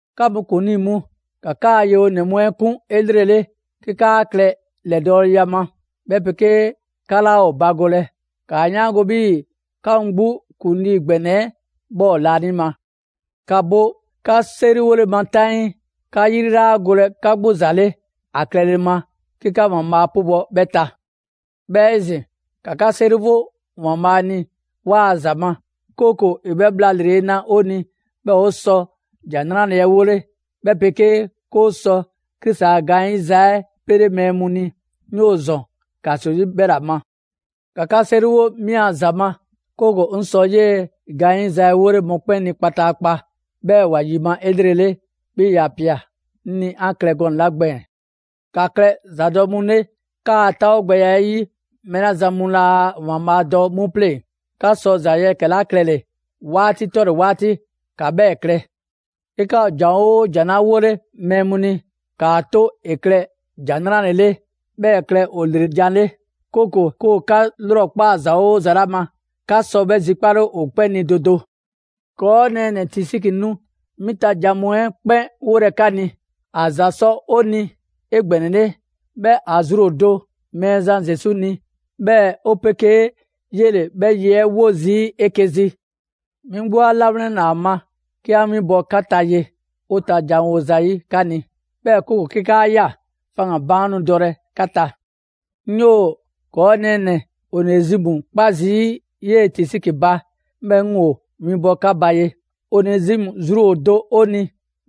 'Ka mu ‑kuŋlii mu, ‑ka 'kaa‑ yewonɛ mu 'ɛ 'kun 'elrele 'ke 'kaa klɛ ‑lɛdɔɔleya ma, 'bhɛ 'pegee 'ka 'laa ‑o bagolɛ. ‑Kaa 'yaango‑ 'bhii‑ 'ka mu 'gbu ‑kuŋlii ‑gbɛnɛ 'ɛ 'bhɛ ‑o laanima. ‑Ka bo 'ka 'seriwole ma 'taŋii, 'ka 'yri 'laa golɛ 'ka 'gbu ‑za 'le ‑a klɛle ma, 'ke 'ka ‑Waanbhaa' 'pubɔ‑ 'bhɛ ta. 'Bhɛɛ‑ 'ezin‑, ‑ka 'ka 'seriwo ‑Waanbhaa' ni 'waa‑ ‑za ma, 'kooko‑ ‑e 'bhɛ bhla ‑lrele' na 'o ni 'bhɛɛ‑ 'o sɔ ‑Jan 'Nrale‑ 'ɛ 'wole, 'bhɛ 'pegee 'ke 'o sɔ Krisi a gaanyiza 'ɛ 'pele mɛɛ mu ni. 'Ŋ 'yoo‑ ‑zɔn ‑kaso 'yi 'bhɛla‑ ma. ‑Ka 'ka 'seriwo 'mi a ‑za ma, 'kooko‑ 'ŋ sɔ 'yee‑ gaanyiza 'ɛ 'wole‑ mɔkpɛn' ni kpataakpa, 'bhɛɛ‑ ‑wa ‑yima' 'elrele, 'bhii‑ ‑ya ꞊pia 'ŋ ni 'an klɛ gɔnɛ‑ 'la gbɛɛn‑. ‑Ka klɛ ‑zadɔ' mu 'le 'kaa‑ 'taawogbɛya 'ɛ 'yi mɛɛ 'la zan mu laa ‑Waanbhaa' dɔ 'mu 'pleŋ‑. 'Ka sɔ ‑za yɛkɛ‑ 'la klɛle‑, 'waati 'tɔle‑ 'waati, ‑ka 'bhɛɛ‑ klɛ. 'Ke 'ka ‑o ‑jan 'oo ‑jan 'la 'wole mɛɛ mu ni, ‑kaa 'to ‑e klɛ ‑jan 'nrale‑ 'le; 'bhɛɛ‑ ‑e klɛ ‑o ‑lre jan 'le. 'Kooko‑ 'ke ‑o 'ka 'lrɔkpaa‑ ‑za 'oo ‑za ‑la ma, 'ka sɔ 'bhɛ zikpale ‑o 'kpɛn ni do do. ‑Kɔɔ' nɛɛnɛ‑ Tisiki nu 'mi ta ‑jan mu 'ɛ 'kpɛn 'wolɛ 'ka ni; ‑a ‑za sɔ 'o ni 'egbɛnɛle, 'bhɛɛ‑ ‑a zru ‑o do Mɛɛzan Zesu ni, 'bhɛɛ‑ 'o 'pegee 'yele‑ 'bhɛ a ye 'ɛ 'wo zii' 'eke‑ zi. 'Mi 'gbu 'a 'lawlɛnna ‑a ma 'ke 'an 'winbɔ‑ 'ka ta ye, 'o ta janwo zayi' 'ka ni, 'bhɛɛ‑ 'kooko‑ 'ke 'kaa ꞊ya, faŋgan‑ baan' nu dɔ 'ka ta. 'Ŋ 'yoo‑ ‑kɔɔ' nɛɛnɛ‑ Onezimu 'kpa zii' 'yee‑ Tisiki ba, 'bhɛɛ‑ 'ŋ ‑wo winbɔ 'ka ba ye. Onezimu zru ‑o do 'o ni,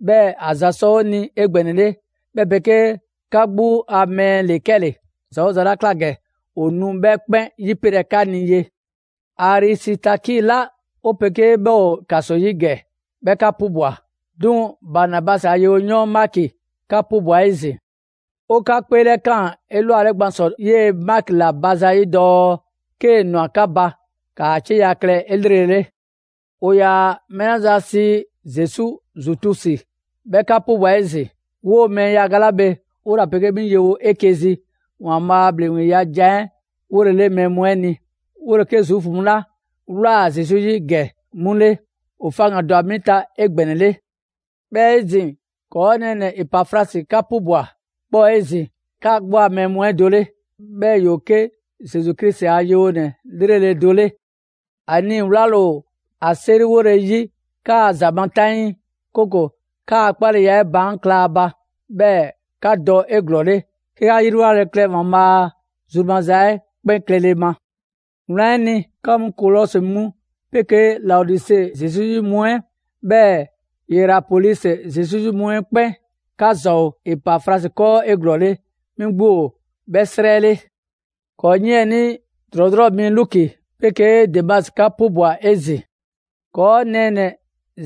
'bhɛɛ‑ ‑a ‑za sɔ 'o ni 'egbɛnɛle, 'bhɛ 'pegee 'ka 'gbu a mɛɛ ‑le 'kɛle‑. ‑Za 'oo ‑za 'la ꞊kla ‑gɛ, ‑o nu 'bhɛ 'kpɛn 'yipelɛ 'ka ni ye. Arisitaki ꞊la 'o 'pegee 'bhɛ ‑o ‑kaso 'yi ‑gɛ, 'bhɛ 'ka 'pubwa‑; 'duŋ‑ Banabasi a yewoyɔɔn Maki 'ka 'pubwa‑ 'ezin‑. 'O 'ka 'kpeelɛkaan 'elwale gban ‑sɔ 'yee‑ Maki 'la ba zayi' dɔɔ 'kee‑ ‑nwa 'ka ba, ‑kaa 'cieya‑ klɛ 'elrele. ‑O ‑yaa mɛɛ 'la zan sii Zesu Zutusi, 'bhɛ 'ka 'pubwa‑ 'ezin‑. 'Woo‑ mɛɛ yaga 'la bhe, 'wola‑ 'pegee 'mi ‑o yewo 'eke‑ zi ‑Waanbhaa' a ‑bhleŋgbeya ‑jan 'ɛ 'wolele mɛɛ mu 'ɛ ni. 'Wole‑ 'ke Zuufu mu 'la ꞊wlaa Zesu 'yi ‑gɛ 'mu 'le. ‑O faŋgan‑ ‑dwa 'mi ta 'egbɛnɛle. 'Bhɛɛ‑ 'ezin‑, ‑kɔɔ' nɛɛnɛ‑ Epafrasi 'ka 'pubwa‑. 'Bhɛ ‑o 'ezin‑ 'ka 'gbu a mɛɛ mu 'ɛ do 'le. 'Bhɛɛ‑ ‑yoo 'ke Zesu Krisi a yewonɛ 'lrele‑ do 'le. ‑A nii‑ 'wlale‑ ‑o ‑a 'seriwole 'yi 'kaa‑ ‑za ma 'taŋii, 'kooko‑ 'kaa‑ 'kpaleya 'ɛ baan' kla ‑a ba, 'bhɛɛ‑ 'ka dɔ 'eglɔɔle, 'ke 'ka 'yriwlale klɛ ‑Waanbhaa' zru maza 'ɛ 'kpɛn klɛle ma. Wlan 'ɛ ni, 'ka mu Kolɔsi mu 'pegee Laodise Zesu 'yi mu 'ɛ, 'bhɛɛ‑ Yerapolisi Zesu 'yi mu 'ɛ 'kpɛn, 'ka ‑za ‑o Epafrasi 'kɔɔ 'eglɔɔle; 'mi 'gbu ‑o 'bhɛ 'srɛ 'le. ‑Kɔɔ' 'yiɛnii ‑drɔɔdrɔɔ' mi Luki 'pegee Demasi 'ka 'pubwa‑ 'ezin‑. ‑Kɔɔ' nɛɛnɛ‑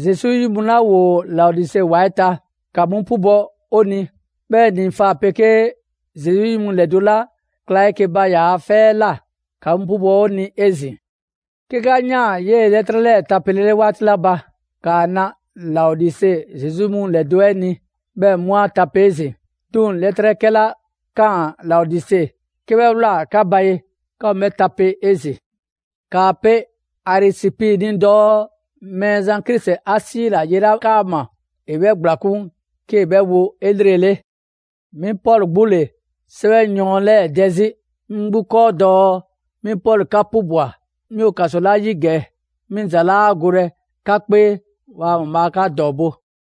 Zesu 'yi mu 'la ‑woo Laodise ‑wa 'ɛ ta, ‑ka 'mu 'pubɔ‑ 'o ni. 'Bhɛɛ‑ Nifa 'pegee Zesu 'yi mu ‑lɛdo' 'la kla 'eke‑ ba ‑yaa' 'fɛ 'ɛ ꞊la, ‑ka 'mu 'pubɔ‑ 'o ni 'ezin‑. 'Ke 'ka ꞊yaan 'yee‑ 'lɛtrɛ 'lɛɛ‑ tapelele 'waati 'la ba, ‑kaa na Laodise Zesu 'yi mu ‑lɛdo' 'ɛ ni, 'bhɛɛ‑ 'mu 'a tape 'ezin‑. 'Duŋ‑ 'lɛtrɛ 'kɛla ꞊kaan Laodise, 'ke 'bhɛ ꞊wlaa 'ka ba ye, 'ka mu 'bhɛ tape 'ezin‑. ‑Kaa pe Arisipi ni dɔɔ Mɛɛzan Krisi 'a 'siila‑ ye 'la 'kaama‑, ‑e 'bhɛ ‑gblakun' 'kee‑ 'bhɛ wo 'elrele. 'Mi Pɔlu 'gbu ‑le 'sɛwɛyɔɔn 'lɛɛ‑ dɛ 'zi 'ŋ 'gbu 'kɔɔ dɔɔ: «'Mi Pɔlu 'ka 'pubwa‑.» 'Mi ‑o ‑kaso 'la 'yi ‑gɛ, 'mi ‑za 'laa golɛ 'ka 'kpee. Bhaa ‑Waanbhaa' 'ka ‑dɔɔbo'!